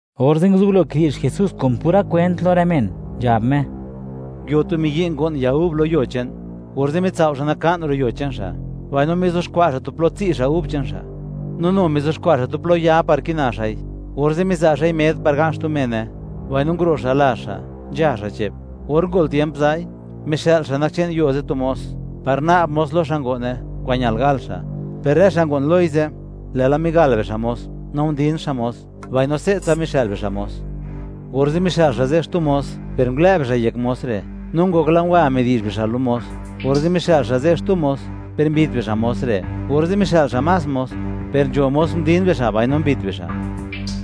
Orze' nguzublo kidi'zh Jesús kun pura kwent lo rë men, nzhab Me: ―Nguio tu miyi', ngo'n ya gub lo yuo che'n; orze' mitsao' xa' naka'n ro' yuo che'n xa', mbaino mizuxkwa' xa' tu plo tsi' xa' gub che'n xa', no nu mizuxkwa' xa' tu plo ya par kina xa'i. Orze' miza' xa'i med par ga'n xtu mene, mbaino nguro' xa' lazh xa', nzha xa' che'p. Or ngol tiemp za'i, mixë'l xa' nak che'n yuo ze' tu mos, par na'b mos lo xa' ngo'ne, kwa'n ñal gal xa'. Per rë xa' ngo'n loi ze', lë'la migal bixa' mos, no ndin xa' mos, mbaino se'tsa mixë'l bixa' mos. Orze' mixë'l xa' ze' xtu mos, per ngulë' bixa' yek mos re', no ngokla ngwa midi'zh bixa' lo mos. Orze' mixë'l xa' ze' xtu mos, per mbit bixa' mos re'. Orze' mixë'l xa' más mos, per nzho mos ndin bixa' mbaino mbit bixa'.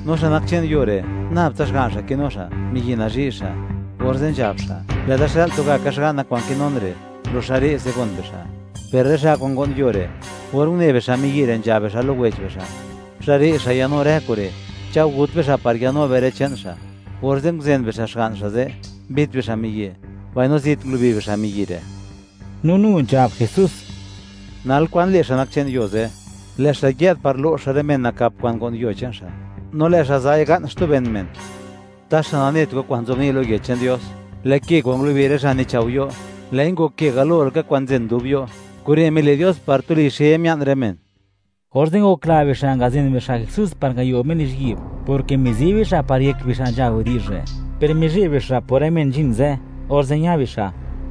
’No xa' nak che'n yuo re', nab tsa xga'n xa' kinu xa', miyi' nazhi' xa'; orze' nzhab xa': “Lë'da xë'l tugaka xga'na kwa'n kinun re'; ro' xa' re'se, gon bixa'.” Per rë xa' kwa'n ngo'n yuo re', or une bixa' miyi' re', nzhab bixa' lo wech bixa': “Xa' re' xa' ya'nu rë kure', cha'o gut bixa', par ya'nu be rë che'n xa'.” Orze' nguzen bixa' xga'n xa' ze', mbit bixa' miyi', mbaino zit ngulubi bixa' miyi' re'. No nu nzhab Jesús: ―Nal, ¿kwa'n le' xa' nak che'n yuo ze'? Lë' xa' yë'd par lo'x xa' rë men nakap kwa'n ngo'n yuo che'n xa', no lë' xa' za'i ga'n xtu ben men. Taxa, ¿nanet go kwa'n nzobni' lo Yech che'n Dios?: Lë' ke kwa'n ngulubi rë xa' nichao' yo', lë'i ngok ke galo laka kwa'n nzen dub yo'. Kure' mile' Dios, par tuli xe mia'n rë men. Orze' ngokla bixa' ngazen bixa' Jesús par ngayo Me lizhyi'b, porke mizi bixa', par yek bixa' nzha widi'zh re'. Per mizheb bixa' por rë men nzhin ze', orze' ña bixa'.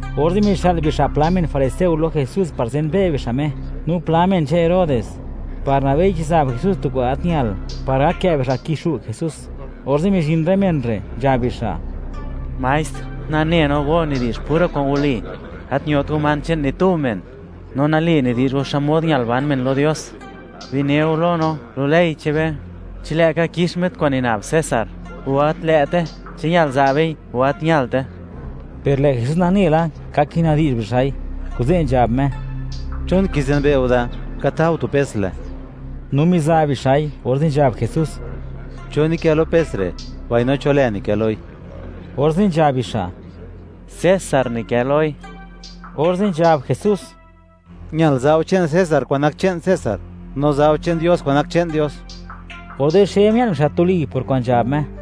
Orze' mixë'l bixa' pla men fariseo lo Jesús par zenbe' bixa' Me (wi' bixa' xmod nak Me), no pla men che'n Herodes, par nabei chi zab Jesús tu kwa'n gat ñal, par gak kë' bixa' kixu' Jesús. Orze' mizhin rë men re', nzhab bixa': ―Maestr, nane no, go nidi'zh pura kwa'n wali, gat ñot go man che'n ni tu men, no nali nidi'zh go xmod ñal ban men lo Dios. Bine go lo no, lo ley che'n be, ¿chi lë'ka kix be kwa'n nina'b César, o gat lë'te? ¿Chi ñal za' bei, o gat ñalte? Per lë' Jesús nane la, ka kina'bdi'zh bixa'i, kuze' nzhab Me: ―¿Chon kizenbe' go da? Ka ta go tu pes le. No miza' bixa'i, orze' nzhab Jesús: ―¿Cho nikë lo pes re', mbaino cho lë nikë loi? Orze' nzhab bixa': ―César nikë loi. Orze' nzhab Jesús: ―Ñal za' go che'n César kwa'n nak che'n César, no za' go che'n Dios kwa'n nak che'n Dios. Orze' xe mia'n bixa' tuli por kwa'n nzhab Me.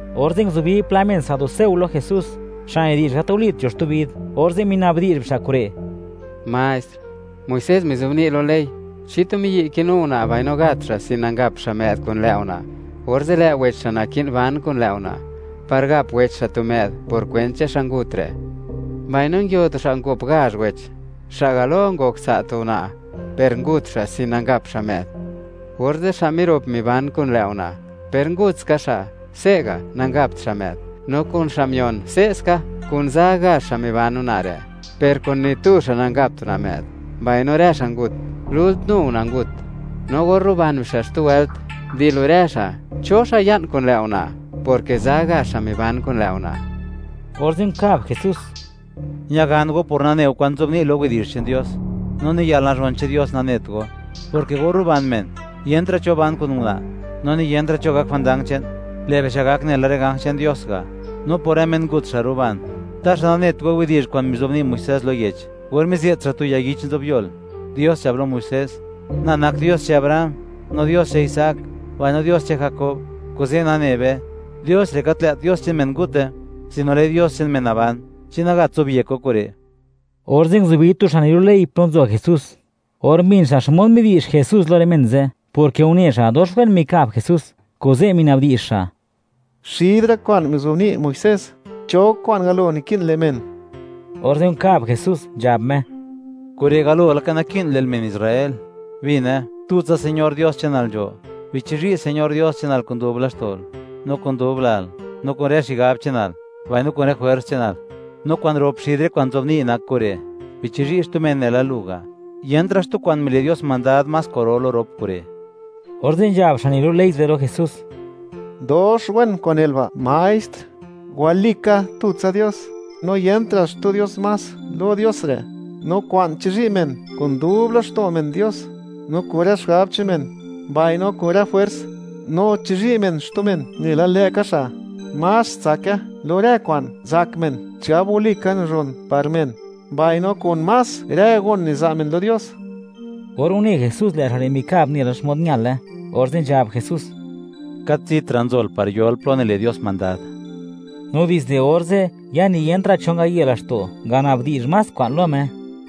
Orze' nguzubi pla men saduceo lo Jesús, xa' nidi'zh: “Gat walit nzho xtu vid”, orze' minabdi'zh bixa' kure': ―Maestr, Muisés mizobni' lo ley: “Chi tu miyi' kinu una' mbaino gat xa' sin nangap xa' më'd kun lë' una', orze' lë' wech xa' naki'n ban kun lë' una', par gap wech xa' tu më'd por kwent che'n xa' ngut re'.” Mbaino nguio tu xa' ngop gazh wech; xa' galo ngok tsa' tu una' per ngut xa' sin nangap xa' më'd; orze' xa' mirop miban kun lë' una', per ngut ska xa', se'ga' nangapt ska xa' më'd. No kun xa' mion, se'ska. Kun za gazh xa' miban una' re', no kun ni tu xa' nangapta' xa' më'd, mbaino rë xa' ngut. Lult, nu una' ngut. No or ruban bixa' xtu wëlt, di lo rë xa', ¿cho xa' ya'n kun lë' una'?, porke za gazh xa' miban kun lë' una'. Orze' nkab Jesús: ―Ñagan go por nane go kwa'n nzobni' lo Yech che'n Dios, no ni yalnazhon che'n Dios nanet go, porke or ruban men, yentra' cho ban kun una', no ni yentra' cho gak jwandang che'n; lë' bixa' gak nela rë ganj che'n Dios ga'. No por rë men ngut xa' ruban, taxa, ¿nanet go widi'zh kwa'n mizobni' Muisés lo yech, or mize't xa' tu ya yich zobyol? Dios nzhab lo Muisés: “Na nak Dios che'n Abraham, no Dios che'n Isaac, mbaino Dios che'n Jakob.” Kuze' nane be, Dios re', gat lë't Dios che'n men ngute, sino lë' Me Dios che'n men naban. ¿Chi nagat zobyekt go kure'? Orze' nguzubi tu xa' nilu' ley, plo nzo Jesús. Or mbin xa' xmod midi'zh Jesús lo rë men ze', porke une xa', dox wen mikab Jesús; kuze' minabdi'zh xa': ―Xid rë kwa'n mizobni' Muisés, ¿cho kwa'n galo naki'n le' men? Orze' nkab Jesús, nzhab Me: ―Kure' galo laka naki'n le'l, men Israel: “Bine: tutsa Señor Dios che'nal nzho. Bichizhi' Señor Dios che'nal kun dub laxto'l, no kun dub lal, no kun rë xigab che'nal, mbaino kun rë jwers che'nal.” No kwa'n rop xid rë kwa'n nzobni' nak kure': “Bichizhi' xtu men nela lu ga'.” Yentra' xtu kwa'n mile' Dios mandad, más kwa'ro lo rop kure'. Orze' nzhab xa' nilu' ley ze' lo Jesús: ―Dox wen kwa'n nel ba', maestr; walika, tutsa Dios, no yentra' xtu Dios más lo Dios re'. No kwa'n chizhi' men kun dub laxto' men Dios, no kun rë xigab che'n men, mbaino kun rë jwers; no chizhi' men xtu men nela lë'ka xa', más tsake lo rë kwa'n zak men chigab walika nazhon par men, mbaino kun más rë gon niza' men lo Dios. Or une Jesús, lë' xa' re' mikab nela xmod ñale, orze' nzhab Jesús: ―Gat zitra' nzol par yol plo nile' Dios mandad. No dizde orze', ya ni yentra' cho ngaye laxto', ngana'bdi'zh más kwa'n lo Me.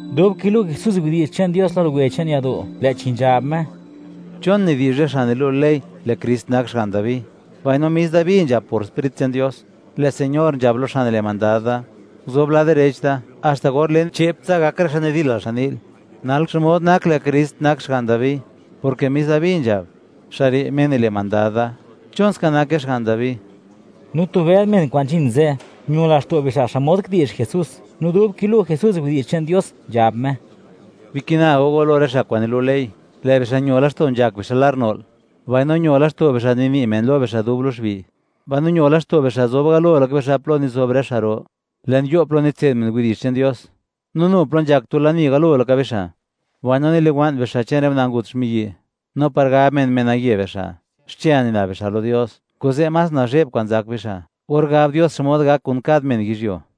Dub kilu' Jesús widi'zh che'n Dios lo luwe che'n yado', lë'chi nzhab Me: ―¿Chon nidi'zh rë xa' nilu' ley, lë' Krist nak xga'n Dabi? Mbaino mis Dabi nzhab por Sprit che'n Dios: Lë' Señor nzhab lo Xa' nile' mandad da: “Guzob lad direch da, haxta or len, che'ptsa gak rë xa' nidilal xan ni'l.” Nal, ¿xmod nak lë' Krist nak xga'n Dabi?, porke mis Dabi nzhab: “Xa' re', Me nile' mandad da.” ¿Chon ska, nake xga'n Dabi? No tu bëd men kwa'n nzhin ze', ño laxto' bixa' xmod kidi'zh Jesús. No dub kilu' Jesús widi'zh che'n Dios, nzhab Me: ―Bikina go go lo rë xa' kwa'n nilu' ley, lë' bixa' ño laxto' nzhak bixa' lar no'l; mbaino ño laxto' bixa', nini' men lo bixa' dub lo xbi'. Mbaino ño laxto' bixa' zob galo laka bixa' plo nizob rë xa' ro, le'n yo' plo nitse'd men widi'zh che'n Dios; no nu plo nzhak tu lani galo laka bixa'. Mbaino niliwa'n bixa' che'n rë una' ngut xmiyi'; no par gab men, menaye bixa', xche nina'b bixa' lo Dios. Kuze', más nazhe'b kwa'n zak bixa' or gab Dios xmod gak kun kad men yizhyuo.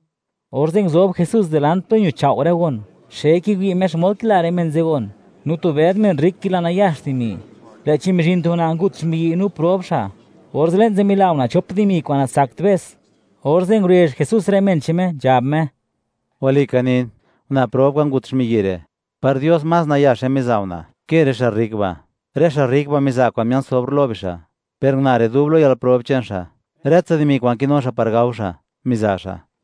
Orze' nguzob Jesús dilant plo ñuchao' rë gon; xe kiwi' Me xmod kila rë men ze' gon, no tu bëd men rrik kila nayax dimi. Lë'chi mizhin tu una' ngut xmiyi', no prob xa'; orze' le'n ze' mila una' chop dimi kwa'n natsakt be's, orze' ngurezh Jesús rë men che'n Me, nzhab Me: ―Walika nin, una' prob kwa'n ngut xmiyi' re', par Dios, más nayaxe miza' una' ke rë xa' rrik ba'; rë xa' rrik ba' miza' kwa'n mia'n sobr lo bixa', per una' re', dub lo yalprob che'n xa', rë tsa dimi kwa'n kinu xa' par gao xa', miza' xa'.